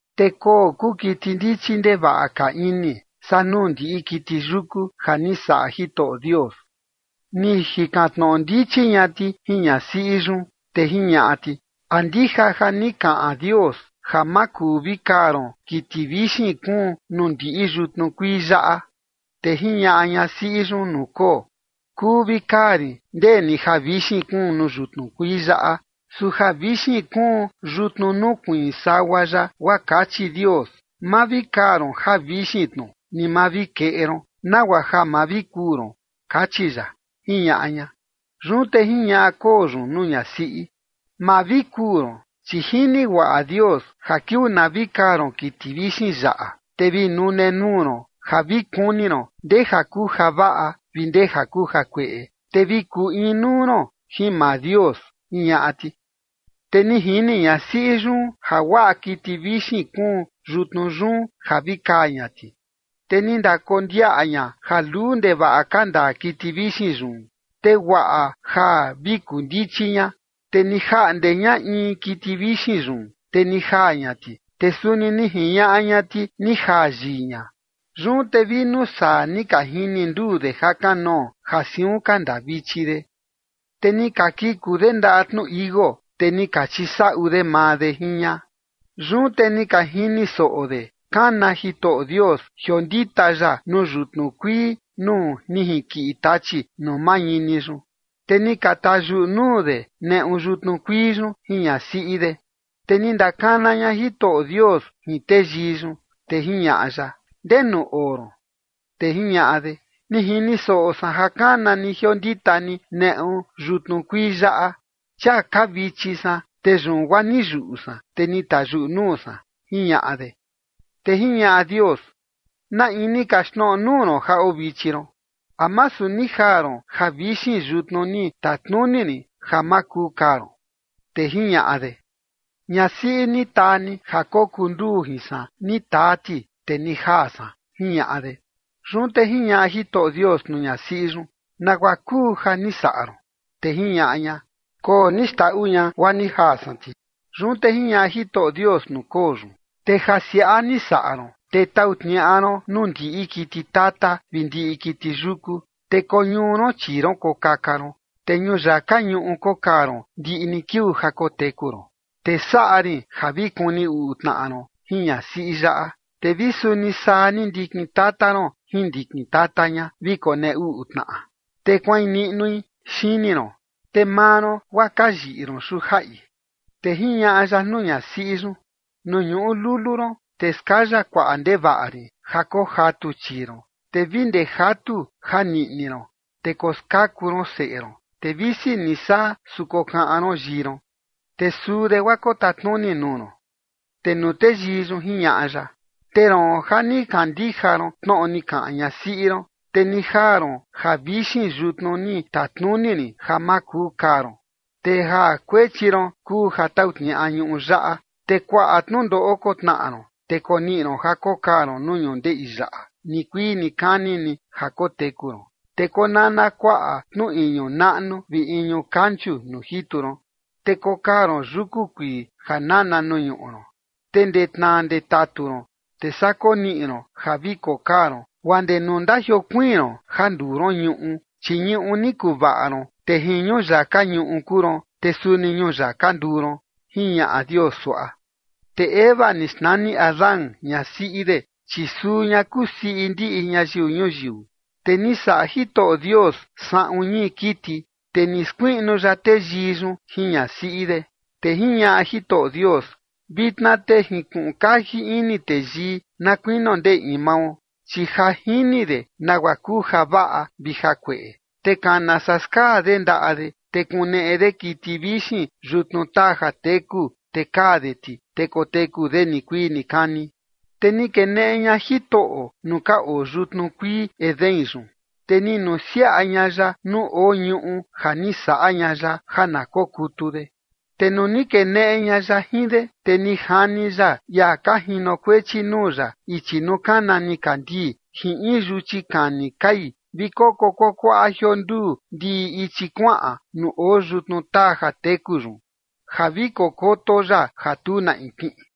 Te koo kuu kiti ndichi ndevaꞌa ka ini saa nuu ndiꞌi kiti yuku ja ni saꞌa Jitoꞌo Dios. Ni jikan tnoꞌo ndichi ña ti jin ñasiꞌi yun, te jiñaꞌa ti: ―¿A ndija ja ni kaꞌan Dios ja ma kuu vi kaa ron kiti vixin kuun nuu ndiꞌi yutnu kuii yaꞌa? Te jiñaꞌa ñasiꞌi yun nuu koo: ―Kuu vi kaa rin ndeni javixin kuun nuu yutnu kuii yaꞌa. Su javixin kuun yutnu nukuiin sagua yaꞌa guaa kachi Dios: “Ma vi kaa ron javixin tnu ni ma vi keꞌe ron, nagua ja ma vi kuu ron”, kachi ya ―jiñaꞌa ña. Yun te jiñaꞌa koo yun nuu ñasiꞌi: ―Ma vi kuu ron, chi jini guaꞌa Dios ja kiuu na vi kaa ron kiti vixin yaꞌa, te vi nune nuu ron ja vi kuni ron ndeja kuu javaꞌa vi ndeja kuu jakueꞌe, te vi kuu inuu ron jin maa Dios ―jiñaꞌa ti. Te ni jini ñasiꞌi yun ja guaꞌa kiti vixin kuun yutnu yun ja vi kaa ña ti, te ni ndakondiaꞌa ña ja luu ndevaꞌa ka ndaa kiti vixin yun, te guaꞌa ja vi kuu ndichi ña, te ni jaꞌnde ña in kiti vixin yun, te ni jaa ña ti, te suni ni jiñaꞌa ña ti ni jaa yii ña. Yun te vi nuu saa ni ka jini nduu de jakanoo ja siun ka ndaa vichi de. Te ni ka kiku de ndaꞌa tnu tichi iuu, te ni ka chisaꞌu de maa de jin ña. Yun te ni ka jini soꞌo de kana Jitoꞌo Dios jiondita ya nuu yutnu kuii nuu ni jinkiꞌi tachi nuu mañini yun. Te ni ka tayuꞌu nuu de neꞌu yutnu kuii yun jin ñasiꞌi de. Te ni ndakana ña Jitoꞌo Dios jin teyii yun, te jiñaꞌa ya: ―¿Ndenu oo ron? Te jiñaꞌa de: ―Ni jini soꞌo san ja kana ni jiondita ni neꞌu yutnu kuii yaꞌa, chia kaa vichi san, te yun guaa ni yuꞌu san, te ni tayuꞌu nuu san ―jiñaꞌa de. Te jiñaꞌa Dios: ―¿Na in ni kaxtnoꞌo nuu ron ja oo vichi ron? ¿A masu ni jaa ron javixin yutnu ni tatnuni rin ja ma kuu kaa ron? Te jiñaꞌa de: ―Ñasiꞌi ni taa ni ja kokuu nduu jin san ni taa ti, te ni jaa san ―jiñaꞌa de. Yun te jiñaꞌa Jitoꞌo Dios nuu ñasiꞌi yun: ―¿Nagua kuu ja ni saꞌa ron? Te jiñaꞌa ña: ―Koo ni xndaꞌu ña, guaa ni jaa san ti. Yun te jiñaꞌa Jitoꞌo Dios nuu koo yun: ―Te ja siaꞌa ni saꞌa ron, te tau tniaꞌa ron nuu ndiꞌi kiti tata vi ndiꞌi kiti yuku, te koñuu ron chii ron kokaka ron, te ñuyaka ñuꞌu kokaa ron ndiꞌi ni kiuu ja koteku ron. Te saꞌa rin ja vi kuni uꞌu tnaꞌa ron jin ñasiꞌi yaꞌa, te vi suni saa ni ndikin tata ron jin ndikin tata ña vi konee uꞌu tnaꞌa, te kuain niꞌnui xini ron, te maa ron guaa kayiꞌi ron xujaꞌi. Te jiñaꞌa ya nuu ñasiꞌi yun: ―Nuu ñuꞌu lulu ron te skaya kuaꞌa ndevaꞌa rin ja kojatu chii ron, te vi ndee jatu ja niꞌni ron te koskaku ron seꞌe ron, te visi ni saa, su kokaꞌan ron yii ron, te suu de guaa kotatnuni nuu ron. Te nuu teyii yun jiñaꞌa ya: ―Te roon ja ni kandija ron tnoꞌo ni kaꞌan ñasiꞌi ron, te ni jaa ron javixin yutnu ni tatnuni rin ja ma kuu kaa ron, te ja kuechi ron kuu ja tau tniaꞌa ñuꞌu yaꞌa, te kuaꞌa tnundoꞌo kotnaꞌa ron, te koniꞌi ron ja kokaa ron nuu ñundeꞌi yaꞌa nikuii nikani ni ja koteku ron. Te konana kuaꞌa tnu iñu naꞌnu vi iñu kanchu nuu jitu ron, te kokaa ron yuku kuii ja nana nuu ñuꞌu ron. Te ndee tnaa ndee tatu ron, te saa koniꞌi ron ja vi kokaa ron guaa ndee nuu ndajiokuiin ron ja nduu ron ñuꞌu, chi ñuꞌu ni kuvaꞌa ron, te jin ñuyaka ñuꞌu kuu ron, te suni ñuyaka nduu ron ―jiñaꞌa Dios suaꞌa. Te Eva ni xnani Adán ñasiꞌi de, chi suu ña kuu siꞌi ndiꞌi ñayiu ñuyiu. Te ni saꞌa Jitoꞌo Dios saꞌun ñii kiti, te ni skuiꞌnu ya teyii yun jin ñasiꞌi de. Te jiñaꞌa Jitoꞌo Dios: “Vitna te ni jinkuꞌun kaji ini teyii na kuinio ndee in mao, chi ja jini de nagua kuu javaꞌa vi jakueꞌe, te kana saa skaa de ndaꞌa de, te kuneꞌe de kiti vixin yutnu taa ja teku, te kaa de ti, te koteku de nikuii nikani”. Te ni keneꞌe ña Jitoꞌo nuu ka oo yutnu kuii Edén yun, te ni nusiaꞌa ña ya nuu oo ñuꞌu ja ni saꞌa ña ya ja na kokutu de. Te nuu ni keneꞌe ña ya jin de, te ni jani ya ia ka jinokuechi nuu ya ichi nuu kana nikandii jin in yuchi kani kai vi koko kuakuaꞌa jionduu ndiꞌi ichi kuaꞌan nuu oo yutnu taa jateku yun, ja vi kokoto ya ja tu na in kiꞌin.